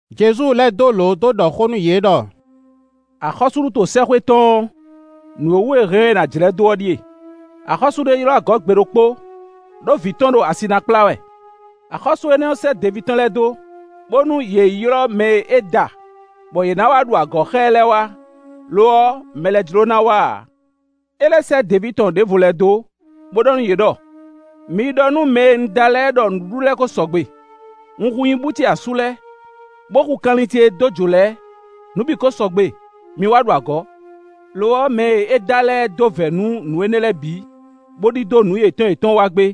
Jezu lɛ́ dó dó ɖɔ xó nú yě ɖɔ: Axɔ́súɖuto sɛ́xwé tɔn ɔ́, nǔ e wú è hɛn ɔ́, è nǎ jlɛ́ dó ɔ́ ɖíe: axɔ́sú ɖé ylɔ́ agɔ̌ gbe ɖokpó, ɖó vǐ tɔn ɖo asi ná kplá wɛ. Axɔ́sú énɛ́ sɛ́ deví tɔn lɛ́ɛ dó, bónú yě yi ylɔ́ mɛ e é da, bɔ yě ná wá ɖu agɔ̌ xá ɛ lɛ́ɛ wá; lo ɔ́, mɛ lɛ́ɛ jló ná wá ǎ. É lɛ́ sɛ́ deví tɔn ɖěvo lɛ́ɛ dó, bó ɖɔ nú yě ɖɔ: ‘Mi yi ɖɔ nú mɛ e un da lɛ́ɛ ɖɔ nǔɖuɖu lɛ́ɛ ko sɔgbe; un hu nyibú ce asú lɛ́ɛ, bó hu kanlin ce e dó jǒ lɛ́ɛ; nǔ bǐ ko sɔgbe; mi wá ɖu agɔ̌.’ Lo ɔ́, mɛ e è da lɛ́ɛ dó vɛ̌ nú nǔ énɛ́ lɛ́ɛ bǐ, bó ɖidó nǔ yětɔn yětɔn wa gbé;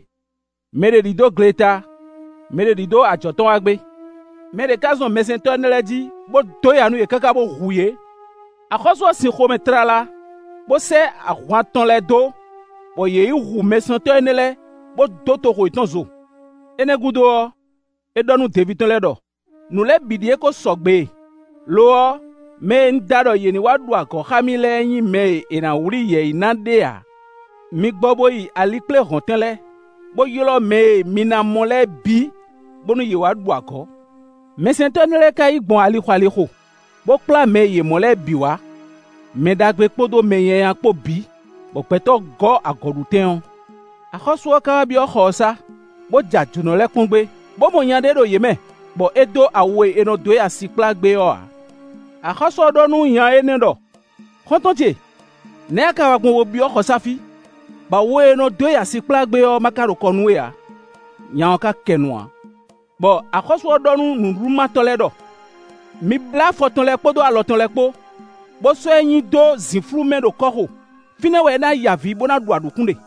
mɛ ɖě ɖidó gleta, mɛ ɖě ɖidó ajɔ̌ tɔn wa gbé. Mɛ ɖě ká zɔn mɛsɛntɔ́ énɛ́ lɛ́ɛ jí, bó dó ya nú yě káká bó hu yě. Axɔ́sú ɔ́ sin xomɛ tlala, bó sɛ́ ahwan tɔn lɛ́ɛ dó, bɔ yě yi hu mɛhutɔ́ énɛ́ lɛ́ɛ, bó dó toxo yětɔn zo. Énɛ́ gúdo ɔ́, é ɖɔ nú deví tɔn lɛ́ɛ ɖɔ: ‘Nǔ lɛ́ɛ bǐ ɖíe ko sɔgbe e; lo ɔ́, mɛ e un da ɖɔ yě ní wá ɖu agɔ̌ xá mì lɛ́ɛ nyí mɛ e è nǎ wlí yɛ̌yi ná ɖé ǎ. Mi gbɔ bó yi alikpléhɔ̌ntɛn lɛ́ɛ, bó ylɔ́ mɛ e mi ná mɔ lɛ́ɛ bǐ, bónú yě ní wá ɖu agɔ̌.’ Mɛsɛntɔ́ énɛ́ lɛ́ɛ ka yi gbɔn ali xo ali xo, bó kplá mɛ e yě mɔ lɛ́ɛ bǐ wá; mɛ ɖagbe kpódó mɛ nyanya kpó bǐ, bɔ gbɛtɔ́ gɔ́ agɔ̌ɖutɛn ɔ́. “Axɔ́sú ɔ́ ka wá byɔ́ xɔ ɔ́ sá, bó ja jǒnɔ lɛ́ɛ kpɔ́n gbé, bó mɔ nya ɖé ɖo yě mɛ, bɔ é dó awu e è nɔ dó yi asi kplá gbé ɔ́ ǎ. Axɔ́sú ɔ́ ɖɔ nú nya énɛ́ ɖɔ: ‘Xɔ́ntɔn ce! Nɛ̌ a ka wa gbɔn bo byɔ́ xɔsá fí, bɔ awu e è nɔ dó yi asi kplá gbé ɔ́ ma ka ɖo kɔ nú we ǎ?’ Nya ɔ́ ka kɛ nu ǎ. Bɔ axɔ́sú ɔ́ ɖɔ nú nǔɖuɖumátɔ́ lɛ́ɛ ɖɔ: ‘Mi blá afɔ tɔn lɛ́ɛ kpódó alɔ tɔn lɛ́ɛ kpó, bó sɔ́ ɛ nyi dó zǐnflú mɛ ɖo kɔ́xo. Fínɛ́ wɛ é ná ya avǐ, bó ná ɖu aɖǔkún ɖe.’”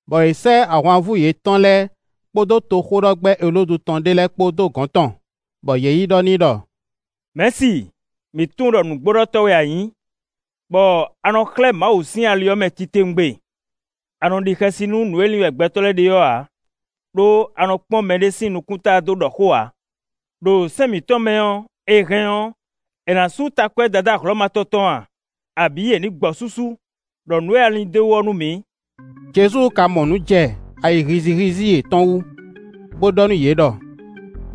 bɔ yě sɛ́ ahwanvú yětɔn lɛ́ɛ kpódó toxóɖɔgbɛ́ Elódu tɔn ɖé lɛ́ɛ kpó dó gɔ̌n tɔn, bɔ yě yi ɖɔ n'i ɖɔ: “Mɛ̌si, mǐ tunwun ɖɔ nǔgbóɖɔtɔ́ wɛ a nyǐ, bɔ a nɔ xlɛ́ Mawu sín ali ɔ́ mɛ titewungbe; a nɔ ɖi xɛsi nú nǔ e lin wɛ gbɛtɔ́ lɛ́ɛ ɖe ɔ́ ǎ, ɖó a nɔ kpɔ́n mɛɖé sín nukúnta dó ɖɔ xó ǎ. Ɖo sɛ́n mǐtɔn mɛ ɔ́, è hɛn ɔ́, è nǎ sú takwɛ́ Dadá Hlɔ̌ma tɔn tɔn a, abǐ è nǐ gbɔ súsú? Ɖɔ nǔ e a lin d'é wú ɔ́ nú mǐ.” Jezu ka mɔ nǔ jɛ ayi hízíhízí yětɔn wú, bó ɖɔ nú yě ɖɔ: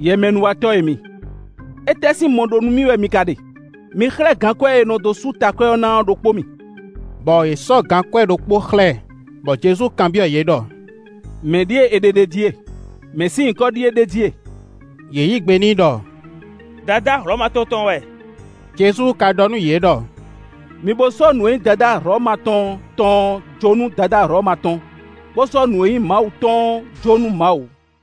“Yɛmɛnúwatɔ́ e mi! Étɛ́ sín mɔ ɖó nú mì wɛ mi ka ɖe? Mi xlɛ́ gankwɛ́ e è nɔ dó sú takwɛ́ ɔ́ ná ɔ́ ɖokpó mì;” bɔ yě sɔ́ gankwɛ́ ɖokpó xlɛ́ ɛ; bɔ Jezu kanbyɔ́ yě ɖɔ: “Mɛ̌ ɖíe è ɖe ɖ'é jí e? Mɛ̌ sín nyǐkɔ ɖíe ɖ'é jí e?” Yě yí gbe n'i ɖɔ: “Dadá Hlɔ̌ma tɔn tɔn wɛ.” Jezu ka ɖɔ nú yě ɖɔ: “Mi bo sɔ́ nǔ e nyí Dadá Hlɔ̌ma tɔn tɔn ɔ́ jó nú Dadá Hlɔ̌ma tɔn, bó sɔ́ nǔ e nyí Mawu tɔn ɔ́ jó nú Mawu.”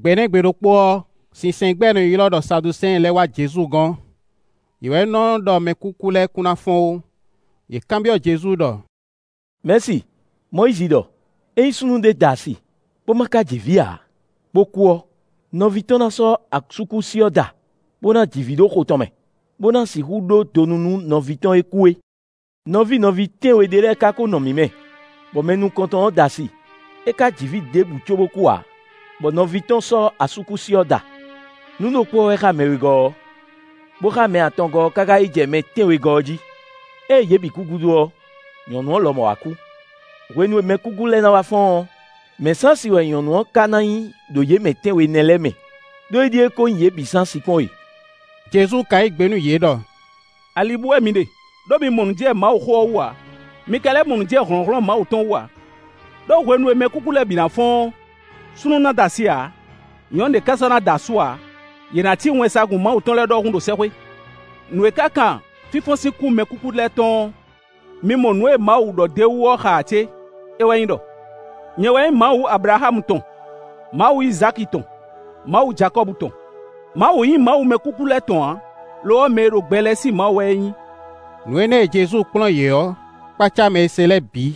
Gbe énɛ́ gbe ɖokpó ɔ́, sinsɛngbɛ́ e è nɔ ylɔ́ ɖɔ Saduseɛn lɛ́ɛ wá Jezu gɔ́n. (Yě wɛ nɔ ɖɔ mɛkúkú lɛ́ɛ kún ná fɔ́n ó.) Yě kanbyɔ́ Jezu ɖɔ: Mɛ̌si, Mɔyízi ɖɔ: ‘Ényí súnnu ɖé da asi, bó ma ka ji vǐ ǎ, bó kú ɔ́, nɔví tɔn ná sɔ́ asúkúsi ɔ́ da, bó ná ji vǐ ɖo xo tɔn mɛ, bó ná sixú ɖó donu nú nɔví tɔn e kú é.’ Nɔví nɔví tɛ́nwe ɖé lɛ́ɛ ka ko nɔ mǐ mɛ, bɔ mɛ nukɔntɔn ɔ́ da asi, é ka ji vǐ ɖěbǔ cóbó kú ǎ; bɔ nɔví tɔn sɔ́ asúkúsi ɔ́ da. Nǔ ɖokpó ɔ́ wɛ xá mɛ wegɔ́ ɔ́; bó xá mɛ atɔngɔ́ ɔ́ káká yi jɛ mɛ tɛ́nwegɔ́ ɔ́ jí. Ée yě bǐ kú gúdo ɔ́, nyɔ̌nu ɔ́ lɔmɔ̌ wá kú. Hwenu e mɛkúkú lɛ́ɛ na wá fɔ́n ɔ́, mɛ̌ sín asi wɛ nyɔ̌nu ɔ́ ka na nyí ɖo yě mɛ tɛ́nwe nɛ́ lɛ́ɛ mɛ? Ɖó é ɖíe ko nyí yě bǐ sín asi kpɔ́n e.” Jezu ka yí gbe nú yě ɖɔ: “Ali bú wɛ mi ɖe, ɖó mi mɔ nǔ jɛ Mawuxó ɔ́ wú ǎ; mi ka lɛ́ mɔ nǔ jɛ hlɔ̌nhlɔ́n Mawu tɔn wú ǎ. Ɖó hwenu e mɛkúkú lɛ́ɛ bǐ ná fɔ́n ɔ́, súnnu na da asi ǎ; nyɔ̌nu ɖě ká sɔ́ ná da asú ǎ, yě ná cí wɛnsagun Mawu tɔn lɛ́ɛ ɖɔhun ɖo sɛ́xwé. Nǔ e ka kan fínfɔ́n sín kú mɛkúkú lɛ́ɛ tɔn ɔ́, mi mɔ nǔ e Mawu ɖɔ d'é wú ɔ́ xa ǎ cé? É wɛ nyí ɖɔ: ‘Nyɛ wɛ nyí Mawu Ablaxámu tɔn, Mawu Izáki tɔn, Mawu Jakɔ́bu tɔn.’ Mawu nyí Mawu mɛkúkú lɛ́ɛ tɔn ǎ; lo ɔ́, mɛ e ɖo gbɛ lɛ́ɛ sín Mawu wɛ é nyí.” Nǔ énɛ́ e Jezu kplɔ́n yě ɔ́ kpácá mɛ e se lɛ́ɛ bǐ.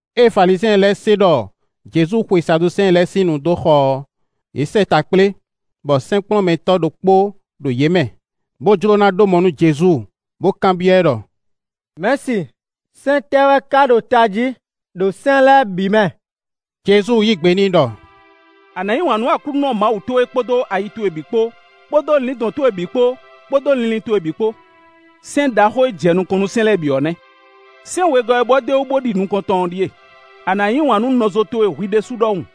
Ée Falizyɛn lɛ́ɛ se ɖɔ Jezu xwe Saduseɛn lɛ́ɛ sín nu dó xɔ ɔ́, yě sɛ́ ta kplé, bɔ sɛ́nkplɔ́nmɛtɔ́ ɖokpó ɖo yě mɛ, bó jló ná ɖó mɔ nú Jezu, bó kanbyɔ́ ɛ ɖɔ: Mɛ̌si, sɛ́n tɛ́ wɛ ka ɖo tají ɖo sɛ́n lɛ́ɛ bǐ mɛ?” Jezu yí gbe n'i ɖɔ: “ ‘A nǎ yí wǎn nú Aklúnɔ Mawu towe kpódó ayi towe bǐ kpó, kpódó lǐndɔ̌n towe bǐ kpó, kpódó linlin towe bǐ kpó.’ Sɛ́n ɖaxó e jɛ nukɔn nú sɛ́n lɛ́ɛ bǐ ɔ́ nɛ́. Sɛ́n wegɔ́ ɔ́ e bɔ d'é wú, bó ɖi nukɔntɔn ɔ́ ɖíe: ‘A nǎ yí wǎn nú nɔzo towe hwi ɖésú ɖɔhun.’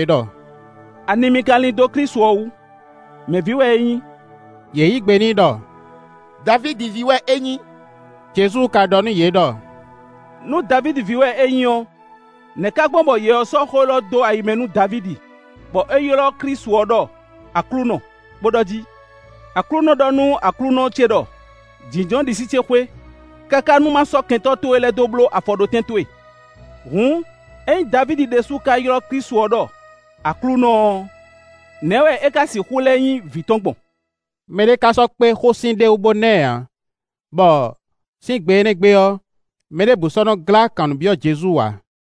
ɖɔ: “Ani mi ka lin dó Klísu ɔ́ wú? Mɛ̌ ví wɛ é nyí?” Yě yí gbe n'i ɖɔ: “Davídi ví wɛ é nyí.” Jezu ka ɖɔ nú yě ɖɔ: “Nú Davídi ví wɛ é nyí ɔ́, nɛ̌ ka gbɔn bɔ Yɛ ɔ́ sɔ́ xó élɔ́ dó ayi mɛ nú Davídi, bɔ é ylɔ́ Klísu ɔ́ ɖɔ: ‘Aklúnɔ,’ bó ɖɔ jí: ‘Aklúnɔ ɖɔ nú Aklúnɔ ce ɖɔ: Jínjɔ́n ɖisí ce xwé, káká nú má sɔ́ kɛntɔ́ towe lɛ́ɛ dó bló afɔɖótɛn towe.’ “Hǔn ényí Davídi ɖésú ka ylɔ́ Klísu ɖɔ: ‘Aklúnɔ’ ɔ́, nɛ̌ wɛ é ka sixú lɛ́ nyí vǐ tɔn gbɔn?” Mɛ ɖé ka sɔ́ kpé xósin ɖé wú bó ná ɛ ǎ; bɔ, sín gbe énɛ́ gbe ɔ́, mɛ ɖěbǔ sɔ́ nɔ́ glá kan nǔ byɔ́ Jezu ǎ.